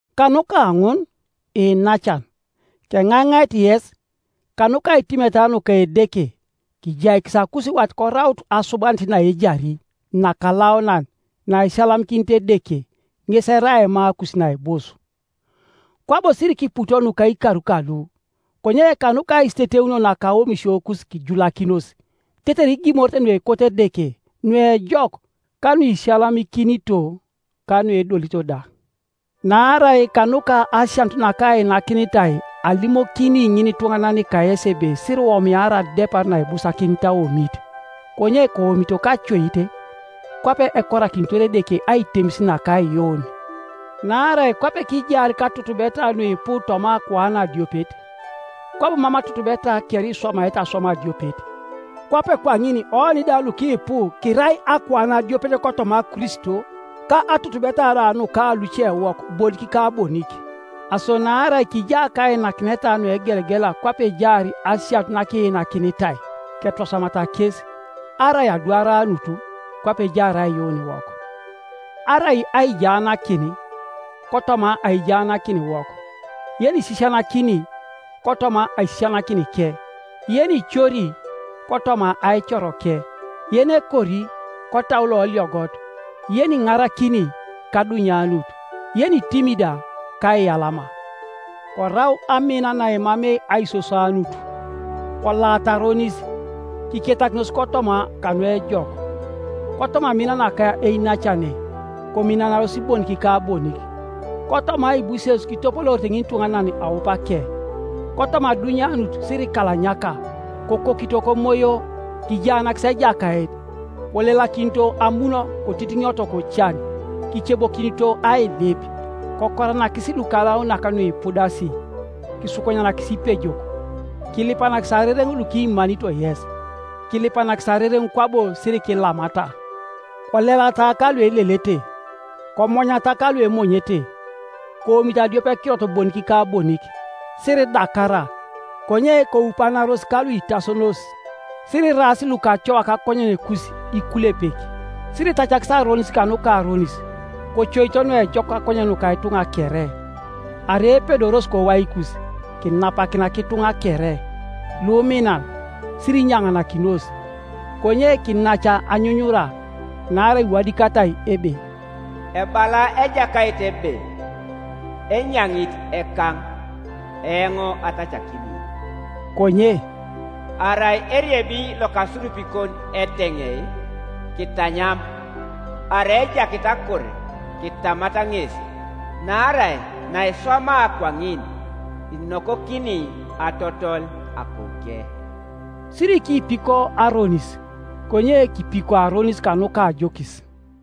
Kanuka ŋun, iinacan, keŋaiŋait yes, kanuka aitimeta nuka Edeke, kijaikis akusiwat koraut asubanit naejari, nakalaunan, naisiyalamikinit Edeke, ŋes erai aimakus naibus. Kwabo sirikiputo nuka ikar kalu, konye kanuka aisiteteunio naka aomisiokus kijulakinos, tetere igimorete nuekoto Edeke, nuejok, ka nuisiyalamikinito, ka nuedolito da. Naarai kanuka asianut nakainakinitai alimokini ŋinituŋanan kayesi ebe siriwomiara adepar naibusakinit aomit, konye koomito kacoit, kwape ekorakinitor Edeke aitemis naka aiyuun. Naarai kwape kijaar katutubeta nuipu toma akuan adiopet, kwabo mam atutubeta kere iswamaete aswam adiopet, kwape kwaŋin oni da lukipu, kirai akuan adiopet kotoma Kristo, ka atutubeta da nuka lucewok bonik ka bonik. Aso naarai kija kainakineta nuegelegela kwape ejaar asianut nakiinakinitai, ketwasamata kes; arai adwaranut, kwape ejaar aiyuuniwok; arai aijaanakin, kotoma aijaanakiniwok; yenisisianakini, kotoma aisisianakinike; yenicori, kotoma aicoroke; yenekori, kotau loliogot; yeniŋarakini, kadunyanut; yenitimi da, kaiyalama. Korau amina naemamei aisoswanut. Kolaata aronis, kiketakinos kotoma kanuejok. Kotoma amin naka einacane, kominanaros bonik ka bonik; kotoma aibuses kitopoloorite ŋinituŋanan aupake. Kotoma adunyanut sirikalanyaka, kokokito komoyo, kijaanakis Ejakait. Kolelakinito amun kotitiŋioto kocan, kicebokinito ailip. Kokoranakisi lukalaunak nuipudasi, kisukunyanakisi ipejok. Kilipanakisi arereŋ lukimanito yes; kilipanakisi arereŋ kwabo sirikilamata. Kolelata kaluelelete, komonyata kaluemonyete. Koomito adiopekirot bonik ka bonik. Siridakara, konye koupanaros kaluitasonos. Siriraas lukacoa kakonyenekus ikulepek. Siritacakis aronis kanuka aronis, kocoito nuejok kakonyen nuka ituŋa kere. Arai epedoros kowaikus, kinapakina kituŋa kere. Luminan, sirinyaŋanakinos, konye kinac anyunyura; naarai iwadikatai ebe, “Ebala Ejakait ebe, Enyaŋit ekaŋ, eoŋ atacakini.” Konye “arai eriebi lokasurupikon eteŋei, kitanyam, arai ejakit akur, kitamat ŋes; naarai naiswamaa kwaŋin inokokini atotole akouke.” Sirikiipiko aronis, konye kipiko aronis kanuka ajokis.